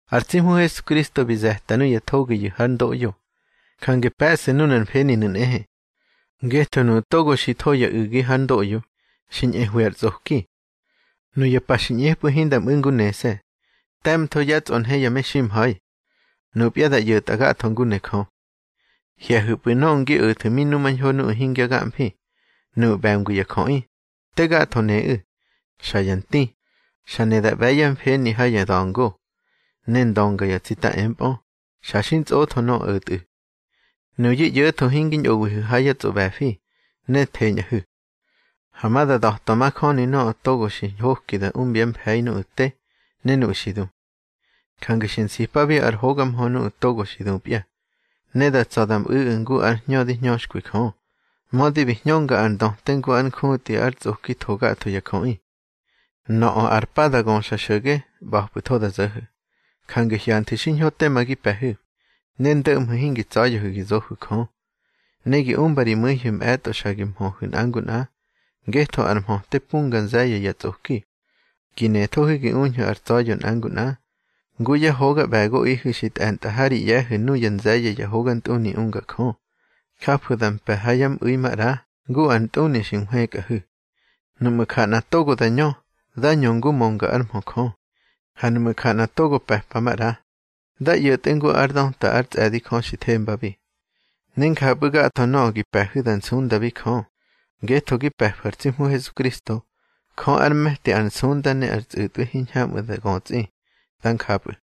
Ar tsi Hmu Hesukristo bi ze̱ta nuya thogiyu̱ hár ndoꞌyo, jange pe̱ꞌsu̱ nunar mfeninu̱ nꞌehe. Ngetho nuꞌu̱ togo xi tho ya u̱gi hár ndoꞌyo, xi ñꞌehwi ar tsꞌoki. Nuya pa xi ꞌñepꞌu̱ hinda mꞌu̱ ngu nese̱, te̱mtho yá tsꞌonhe ya meximha̱i. Nupya da ꞌyo̱tꞌa gatho ngu ne Jö. Hye̱hu̱pꞌu̱ nöꞌö ngi o̱thu̱ mi numañho nuꞌu̱ hingya gamfi. Nuꞌu̱ ꞌbe̱ngwi ya jöꞌi, te gatho neꞌu̱, xa ya nti, xa ne da ꞌbe̱ yá mfeni ha ya da̱ngo, ne ndönga ya tsita empꞌö, xa xi ntsꞌotho nöꞌö o̱tꞌu̱. Nuyu̱ ꞌyo̱tho hingi ñꞌowihu̱ ha yá tsꞌoꞌbe̱fi, ne theñꞌahu̱. Ha ma da da̱twa majöni nöꞌö togo xi ñhoki da umbyá mfe̱i nuꞌu̱ te, ne nuꞌu̱ xi du. Jange xi nsipabi ar hoga mhö nuꞌu̱ togo xi dupya, ne da tsa̱ da mꞌu̱ꞌu̱ ngu ar hñö di hñöxkwi Jö, mödi bi hñönga ar ndöte ngu ar njutꞌi ar tsꞌoki tho gatho ya jöꞌi. Nöꞌö ar pa da göxa xo̱ge, ꞌba̱pꞌu̱tho da zo̱ho̱. Jange hyanthu̱ xiñho tema gi pe̱hu̱, ne ndöꞌmhu̱ hingi tsa̱ya̱hu̱ gi zohu̱ Jö. Ne gi umba ri mu̱ihu̱ mꞌe̱tꞌo xa gi mhöhu̱ nꞌa ngu nꞌa, ngetho ar mhöte punga nze̱ye̱ ya tsꞌoki. Gi nethohu̱ gi uñhu̱ ar tsa̱ya̱ nꞌa ngu nꞌa. Ngu yá hoga ꞌbe̱goꞌihu̱ xi tꞌe̱ntꞌa ha ri ꞌye̱hu̱ nuya nze̱ye̱ ya hogantꞌuni unga Jö, jafu̱ da mpe̱ ha yá mꞌu̱i maꞌra ngu ar ntꞌuni xi nhwëkꞌahu̱. Nuꞌmu̱ ja nꞌa togo ñö, dá ñö ngu mönga ár mhö Jö. Ha nuꞌmu̱ ja nꞌa togo pe̱pa maꞌra, dá ꞌyo̱tꞌe ngu ár döta ár tsꞌe̱di Jö xi thembabi. Ne njapꞌu̱ gatho nöꞌö gi pe̱hu̱ da nsundabi Jö, ngetho gi pe̱fu̱ ar tsi Hmu Hesukristo. Jö ár me̱ti ar nsunda ne ar tsꞌu̱tꞌwi hiñhamꞌu̱ da götsꞌi. Dá njapꞌu̱.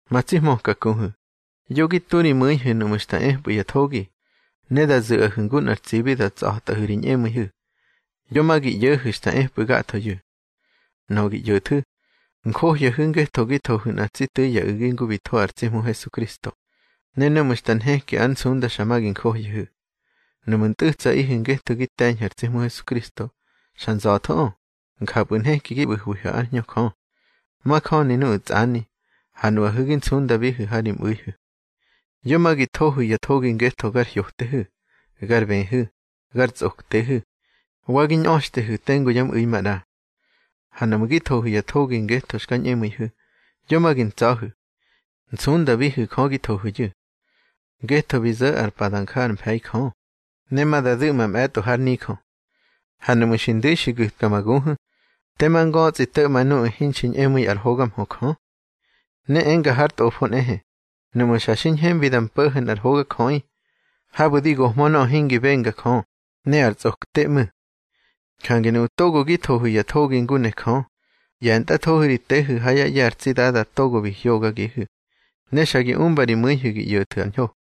Ma tsi hmöka kuhu̱, yo gi tu ri mu̱ihu̱ nuꞌmu̱ xta epꞌu̱ ya thogi, ne da zu̱ꞌahu̱ ngu nꞌar tsibi da tsa̱tꞌahu̱ ri ñꞌemu̱ihu̱. Yo ma gi ꞌyo̱hu̱ xta epꞌu̱ gathoyu̱. Nöꞌö gi ꞌyo̱thu̱, njohyahu̱ ngetho gi thohu̱ nꞌa tsi tu̱i ya u̱gi ngu bi tho ar tsi Hmu Hesukristo, ne núꞌmu̱ xta nheki ár nsunda xa ma gi njohyahu̱. Nuꞌmu̱ ntꞌu̱tsaꞌihu̱ ngetho gi te̱ñhu̱ ar tsi Hmu Hesukristo, xa nza̱thoꞌö, njapꞌu̱ nheki gi ꞌbu̱hwihu̱ ár Hñö Jö. Majöni nuꞌu̱ tsani, ha nuꞌahu̱ gi nsundabihu̱ ha ri mꞌu̱ihu̱. Yo ma gi thohu̱ ya thogi ngetho gar hyotehu̱, gar bëhu̱, gar tsꞌoktehu̱, wa gi ñꞌöxtehu̱ tengu yá mꞌu̱i maꞌra. Ha nuꞌmu̱ gi thohu̱ ya thogi ngetho xka ñꞌemu̱ihu̱, yo ma gi ntsa̱hu̱. Nsundabihu̱ Jö gi thohu̱yu̱. Ngetho bi zo̱ ar pa da nja ár mfe̱i Jö, ne ma da du̱ꞌma mꞌe̱tꞌo hár nijö. Ha nuꞌmu̱ xi ndu̱i xi gu̱tka ma guhu̱, tema ngötsꞌi to̱ꞌma nuꞌu̱ hinxi ñꞌemu̱i ár hoga mhö Jö. Ne enga har Tꞌofo nꞌehe: Nuꞌmu̱ xa xi ñhembi da mpo̱ho̱ nꞌar hogajöꞌi, habu̱ di gohmö nöꞌö hingi benga Jö, ne ar tsꞌokte ꞌmu̱. Jange nuꞌu̱ togo gi thohu̱ ya thogi ngu ne Jö, ꞌye̱ntꞌathohu̱ ri tehu̱ ha yá ꞌye̱ ar tsi Dada togo bi hyogagihu̱, ne xa gi umba ri mu̱ihu̱ gi ꞌyo̱thu̱ ar ñho.